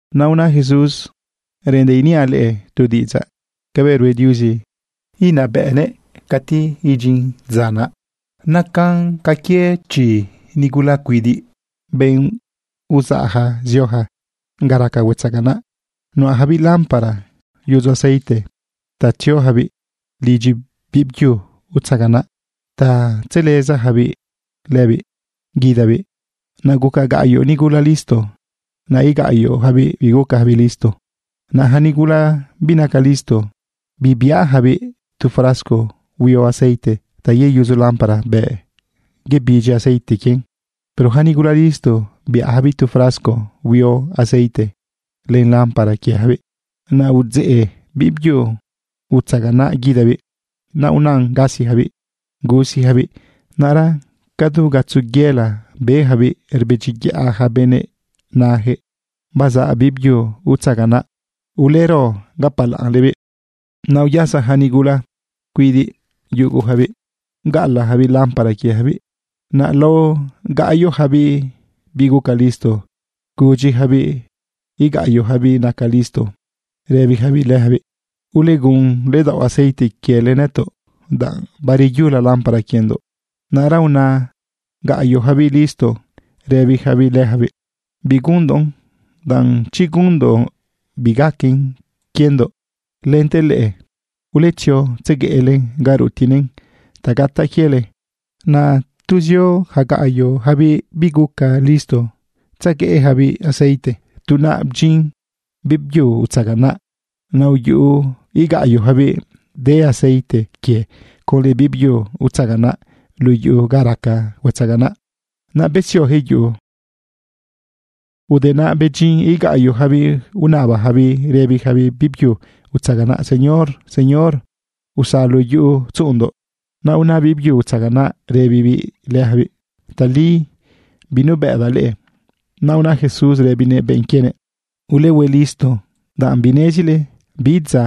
Naꞌ una Jesús: ―Reꞌendaꞌ iniaꞌ leꞌe tu diꞌidzaꞌ cabëꞌ rue Diuzi inabëꞌnëꞌ cati idyin dza naꞌ. Nacan ca quie chi nigula cuidiꞌ, benꞌ uzaꞌja zioja ga raca huetzaganaꞌ. Nuꞌajabiꞌ lámpara yudzo aceite ta tziojabiꞌ lidyi bibyu utzaganaꞌ ta tzelezajabiꞌ lëbiꞌ guidabiꞌ. Naꞌ guca gaꞌyoꞌ nigula listo. Naꞌ igaꞌyoꞌjabiꞌ bigucajabiꞌ listo. Naꞌ ja nigula binaca listo bibiꞌajabiꞌ tu frasco huio aceite ta yeyudzo lámpara bëꞌ bebidyi aceite quien. Pero ja nigula listo biꞌajabiꞌ tu frasco huio aceite len lámpara quiejabiꞌ. Naꞌ udzë biꞌbyu utzaganaꞌ guidabiꞌ. Naꞌ unan gasijabiꞌ gusijabiꞌ. Naꞌra ca du gatzo yela bejabiꞌ rbedyiyaꞌ ja benëꞌ unajëꞌ: “¡Bazaꞌ biꞌbyu utzaganaꞌ! ¡Ulero gapalaꞌnlebiꞌ!” Naꞌ uyasa ja nigula cuidiꞌ yugujabiꞌ bgaꞌalaꞌjabiꞌ lámpara quiejabiꞌ. Naꞌ lao gaꞌyoꞌjabiꞌ biguca listo gudyijabiꞌ igaꞌyoꞌjabiꞌ naca listo rëbijabiꞌ lëjabiꞌ: “Ulegun ledaoꞌ aceite quiele nëtoꞌ, danꞌ bareyula lámpara quiendoꞌ.” Naꞌra una gaꞌyoꞌjabiꞌ listo rëbijabiꞌ lëjabiꞌ: “Bigunndoꞌn, danꞌ chi gunndoꞌn, bigaquen quiendoꞌ lente leꞌe. Uletzio tzegueꞌlen ga rutiꞌnëꞌn ta gataꞌ quiele.” Naꞌ tu zio ja gaꞌyoꞌjabiꞌ biguca listo tzegueꞌjabiꞌ aceite, tu naꞌ bdyin biꞌbyu utzaganaꞌ. Naꞌ uyuꞌu igaꞌyoꞌjabiꞌ de aceite quie conlë biꞌbyu utzaganaꞌ luꞌu yuꞌu ga raca huetzaganaꞌ. Naꞌ besiojëꞌ yuꞌu. Ude naꞌ bedyin igaꞌyoꞌjabiꞌ unajabiꞌ rëbijabiꞌ biꞌbyu utzaganaꞌ: “¡Señor, Señor, usalu yuꞌu tzuꞌundoꞌ!” Naꞌ una biꞌbyu utzaganaꞌ rëbibiꞌ lëjabiꞌ: “Tali binubëꞌdaꞌ leꞌe.” Naꞌ una Jesús rëbinëꞌ benꞌ quienëꞌ: ―Ulehue listo, danꞌ binezile bi dza,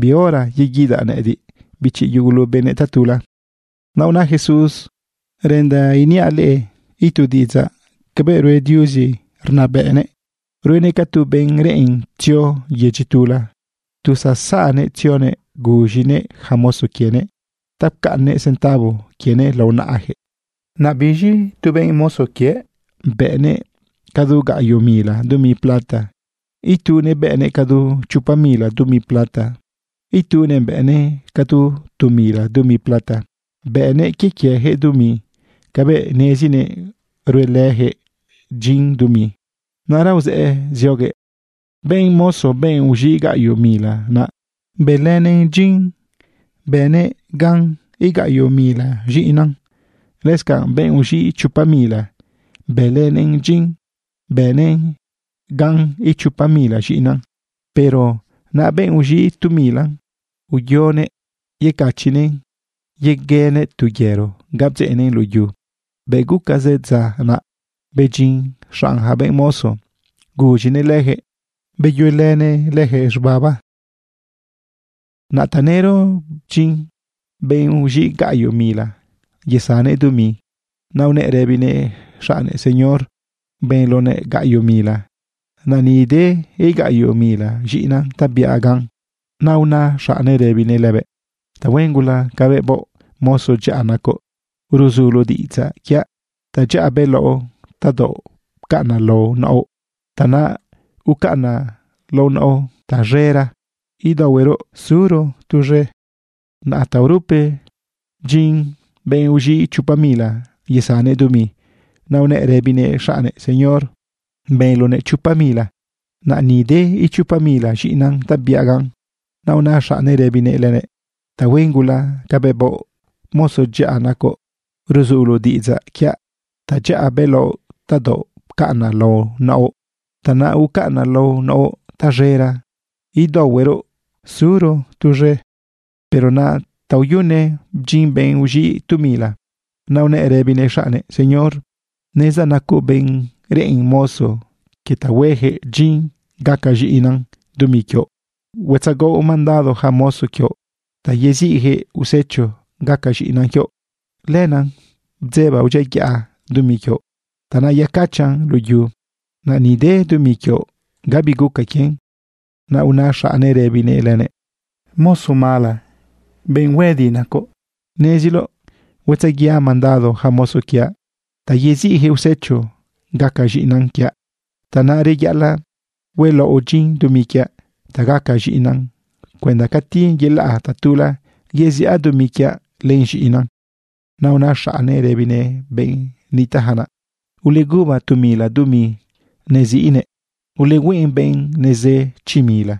bi hora, yeguidaꞌ nëꞌëdiꞌ, bichi yugulu benëꞌ, tatula. Naꞌ una Jesús: ―Reꞌendaꞌ iniaꞌ leꞌe itu diꞌidzaꞌ cabëꞌ rue Diuzi rnabëꞌnëꞌ. Ruenëꞌ ca tu benꞌ reꞌen tzio yedyi tula. Tu zazaꞌnëꞌ tzionëꞌ guz̃inëꞌ ja mozo quienëꞌ ta pcaꞌnnëꞌ centavo quienëꞌ lao naꞌajëꞌ. ’Naꞌ biz̃i tu benꞌ mozo quiëꞌ bëꞌnëꞌ cadu gaꞌyoꞌ mila dumi plata. Itunëꞌ bëꞌnëꞌ cadu chopa mila dumi plata. Itunëꞌ bëꞌnëꞌ cadu tu mila dumi plata. Bëꞌnëꞌ quie quiejëꞌ dumi cabëꞌ nezinëꞌ ruelëjëꞌ dyin dumi. Naꞌra uzëꞌë zioguëꞌ. Benꞌ mozo, benꞌ uz̃iꞌ gaꞌyoꞌ mila naꞌ, bëlënëꞌn dyin bënëꞌ gan igaꞌyoꞌ mila z̃iꞌinan. Lëscanꞌ benꞌ uz̃iꞌ chopa mila, bëlënëꞌn dyin bënëꞌ gan ichopa mila z̃iꞌinan. Pero naꞌ benꞌ uz̃iꞌ tu mila, uyonëꞌ yecachiꞌnëꞌn yeguenëꞌ tu yero ga bdzeꞌnëꞌn luꞌu yu. ’Bëꞌ guca zë dza, naꞌ bedyin xanꞌ ja benꞌ mozo guz̃inëꞌ lëjëꞌ beyuelënëꞌ lëjëꞌ z̃ubaba. Naꞌ tanëro bdyin benꞌ uz̃iꞌ gaꞌyoꞌ mila yesannëꞌ dumi. Naꞌ unëꞌ rëbinëꞌ xaꞌnnëꞌ: “Señor, benloꞌnëꞌ gaꞌyoꞌ mila. Naꞌ ni de igaꞌyoꞌ mila z̃iꞌinan ta biaꞌ gan.” Naꞌ una xaꞌnnëꞌ rëbinëꞌ lëbëꞌ: “Tahuen gula cabëꞌ baoꞌ. Mozo dyaꞌa nacoꞌ, ruzuloꞌ diꞌidzaꞌ quiaꞌ. Tadyaꞌa bëlaoꞌ tadaoꞌ pcaꞌnaꞌ lao naoꞌ, tanaꞌ ucaꞌnaꞌ lao naoꞌ taz̃era, idaohuero suro tuz̃e.” Naꞌ taorupe bdyin benꞌ uz̃iꞌ chopa mila yesannëꞌ dumi. Naꞌ unëꞌ rëbinëꞌ xaꞌnnëꞌ: “Señor, benloꞌnëꞌ chopa mila. Naꞌ ni de ichopa mila z̃iꞌinan ta biaꞌ gan.” Naꞌ una xaꞌnnëꞌ rëbinëꞌ lëbëꞌ: “Tahuen gula cabëꞌ baoꞌ. Mozo dyaꞌa nacoꞌ, ruzuloꞌ diꞌidzaꞌ quiaꞌ. Tadyaꞌa bëlaoꞌ tadaoꞌ pcaꞌnaꞌ lao naoꞌ, tanaꞌ ucaꞌnaꞌ lao naoꞌ taz̃era, idaohuero suro tuz̃e.” Pero naꞌ taoyune bdyin benꞌ uz̃iꞌ tu mila. Naꞌ unëꞌ rëbinëꞌ xaꞌnnëꞌ: “Señor, nezdaꞌ nacoꞌ benꞌ reꞌen mozo quie ta huejëꞌ dyin gaca z̃iꞌinan dumi quioꞌ. Huetzagaoꞌ mandado ja mozo quioꞌ ta yeziꞌjëꞌ usecho gaca z̃iꞌinan quioꞌ. Lenaꞌ bdzebaꞌ udyiayaꞌa dumi quioꞌ. Tanaꞌ yecachaꞌn luꞌu yu. Naꞌ ni de dumi quioꞌ. Gabi guca quien.” Naꞌ una xaꞌnnëꞌ rëbinëꞌ lënëꞌ: “Mozo mala z̃an huëdi nacoꞌ. Neziloꞌ huetzaguiaꞌ mandado ja mozo quiaꞌ ta yeziꞌjëꞌ usecho gaca z̃iꞌinan quiaꞌ. Tanaꞌ reyaꞌalaꞌ huelaoꞌ dyin dumi quiaꞌ ta gaca z̃iꞌinan cuenda cati yelaꞌ tatula yeziꞌa dumi quiaꞌ len z̃iꞌinan.” Naꞌ una xaꞌnnëꞌ rëbinëꞌ benꞌ nitaꞌja naꞌ: “Uleguba tu mila dumi neziꞌnëꞌ. Ulehueꞌn benꞌ nezë chi mila.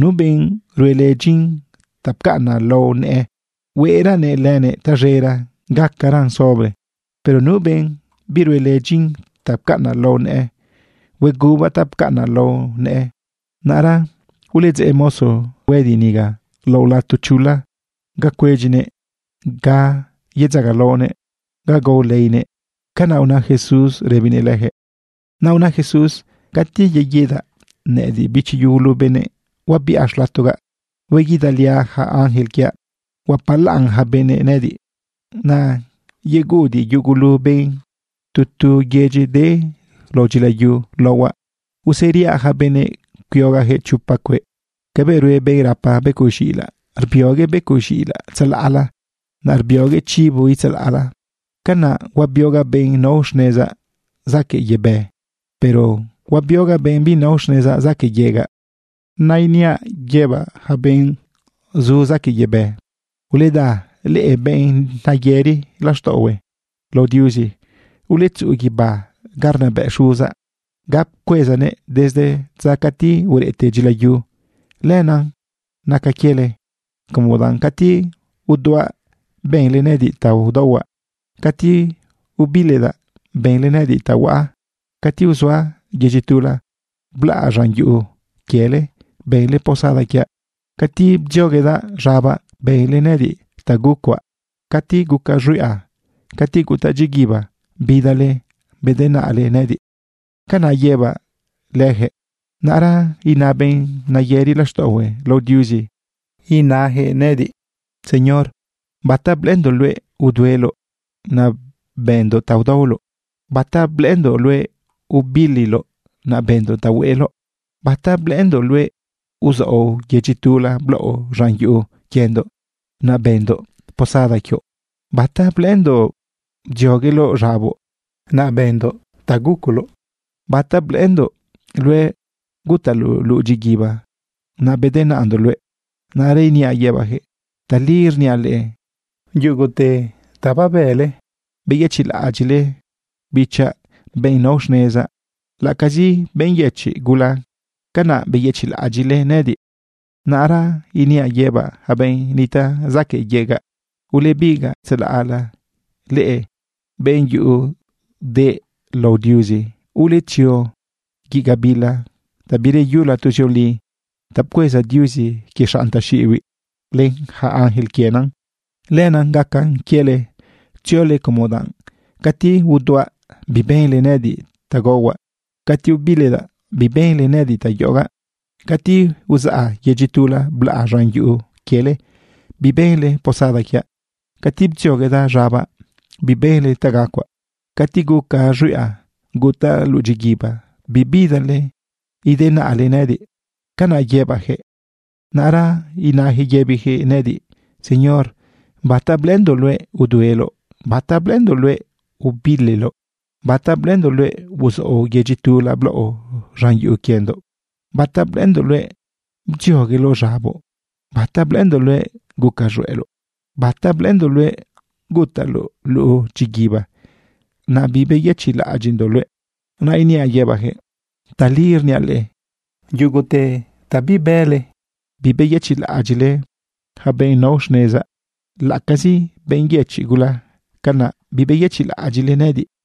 Nu benꞌ ruelë dyin ta pcaꞌnaꞌ lao nëꞌë, hueꞌraꞌlënëꞌ tazëra gacaran sobre. Pero nu benꞌ biruelë dyin ta pcaꞌnaꞌ lao nëꞌë, huegubaꞌ ta pcaꞌnaꞌ lao nëꞌë. Naꞌra uledzeꞌ mozo z̃an huëdi niga lao lato chula ga cuedyinëꞌ, ga yedzagalaonëꞌ, ga gao leinëꞌ.” ―Canaꞌ una Jesús rëbinëꞌ lëjëꞌ. Naꞌ una Jesús: ―Cati yeguidaꞌ nëꞌëdiꞌ, bichi yugulu benëꞌ, huabiꞌa xlatogaꞌ. Hueguidaliaꞌ ja ángel quiaꞌ. Huapalaꞌn ja benëꞌ nëꞌëdiꞌ. Naꞌ yeguꞌudiꞌ yugulu benꞌ tu tu yedyi de lao dyilayu laohuaꞌ. Useriaꞌ ja benëꞌ cuiogaꞌjëꞌ chopa cueꞌ cabëꞌ rue benꞌ rapa becoꞌ z̃iꞌilaꞌ, rbioguëꞌ becoꞌ z̃iꞌilaꞌ tzalaꞌla, naꞌ rbioguëꞌ chivo itzalaꞌla. Canaꞌ huabiogaꞌ benꞌ nao xnezaꞌ zaquëꞌ yebë, pero huabiogaꞌ benꞌ binao xnezaꞌ zaquëꞌ yegaꞌ. Naꞌ iniaꞌ yëbaꞌ ja benꞌ zu zaquëꞌ yebë: “Uleda leꞌe, benꞌ neyëri laxtaꞌohue lao Diuzi. Uletzuꞌu guibá ga arnabëꞌ xuzaꞌ, ga pcuezanëꞌ desde dza cati ureꞌte dyilayu. Lenaꞌ naca quiele, como danꞌ cati uduaꞌ, benle nëꞌëdiꞌ ta udaohuaꞌ. Cati ubilidaꞌ, benle nëꞌëdiꞌ ta huaꞌa. Cati uzaꞌa yedyi tula blaꞌa z̃an yuꞌu quiele, benle posada quiaꞌ. Cati bdzioguedaꞌ z̃abaꞌ, benle nëꞌëdiꞌ ta gucuaꞌ. Cati gucaꞌ z̃huiꞌa, cati gutaꞌ dyiguiba, bidale bedenaꞌle nëꞌëdiꞌ.” Canaꞌ yëbaꞌ lëjëꞌ. Naꞌra ina benꞌ neyëri laxtaꞌohue lao Diuzi yëbijëꞌ nëꞌëdiꞌ: “Señor, ¿bata blëꞌëndoꞌ luëꞌ udueloꞌ, naꞌ benndoꞌ ta udaoloꞌ? ¿Bata blëꞌëndoꞌ luëꞌ ubililoꞌ, naꞌ benndoꞌ ta hueꞌ eloꞌ? ¿Bata blëꞌëndoꞌ luëꞌ uzaoꞌ yedyi tula blaoꞌ z̃an yuꞌu quiendoꞌ, naꞌ benndoꞌ posada quioꞌ? ¿Bata blëꞌëndoꞌ bdziogueloꞌ z̃aboꞌ, naꞌ benndoꞌ gucoloꞌ? ¿Bata blëꞌëndoꞌ luëꞌ gutaꞌloꞌ luꞌu dyiguiba, naꞌ bedenaꞌndoꞌ luëꞌ?” Naꞌra iniaꞌ yëbaꞌjëꞌ: “Tali rniaꞌ leꞌe, yugute ta babële beyëchiꞌlaꞌadyiꞌle bichaꞌ, benꞌ nao xnezaꞌ, laꞌacazi benꞌ yëchiꞌ gula, canaꞌ beyëchiꞌlaꞌadyiꞌle nëꞌëdiꞌ.” ’Naꞌra iniaꞌ yëbaꞌ ja benꞌ nitaꞌ zaquëꞌ yegaꞌ: “Ulebigaꞌ tzalaꞌla leꞌe benꞌ yuꞌu deꞌ lao Diuzi. Uletzio guiꞌ gabila ta bireyula tuzioli ta pcueza Diuzi quie xanꞌ taxiꞌibiꞌ len ja ángel quienan. Lenaꞌ gaca quiele tziole, como danꞌ cati uduaꞌ, bibenle nëꞌëdiꞌ ta gaohuaꞌ. Cati ubilidaꞌ, bibenle nëꞌëdiꞌ ta yoꞌogaꞌ. Cati uzaꞌa yedyi tula blaꞌa z̃an yuꞌu quiele, bibenle posada quiaꞌ. Cati bdzioguedaꞌ z̃abaꞌ, bibenle ta gacuaꞌ. Cati guca z̃huiꞌa, gutaꞌ luꞌu dyiguiba, bibidale bedenaꞌle nëꞌëdiꞌ.” Canaꞌ yëbaꞌ lëjëꞌ. Naꞌra inajëꞌ yëbijëꞌ nëꞌëdiꞌ: “Señor, ¿bata blëꞌëndoꞌ luëꞌ udueloꞌ? ¿Bata blëꞌëndoꞌ luëꞌ ubililoꞌ? ¿Bata blëꞌëndoꞌ luëꞌ uzaoꞌ yedyi tula blaoꞌ z̃an yuꞌu quiendoꞌ? ¿Bata blëꞌëndoꞌ luëꞌ bdziogueloꞌ z̃aboꞌ? ¿Bata blëꞌëndoꞌ luëꞌ guca z̃hueꞌloꞌ? ¿Bata blëꞌëndoꞌ luëꞌ gutaꞌloꞌ luꞌu dyiguiba, naꞌ bibeyëchiꞌlaꞌadyiꞌndoꞌ luëꞌ?” Naꞌ iniaꞌ yëbaꞌjëꞌ: “Tali rniaꞌ leꞌe, yugute ta bibële bibeyëchiꞌlaꞌadyiꞌle ja benꞌ nao xnezaꞌ, laꞌacazi benꞌ yëchiꞌ gula, canaꞌ bibeyëchiꞌlaꞌadyiꞌle nëꞌëdiꞌ.”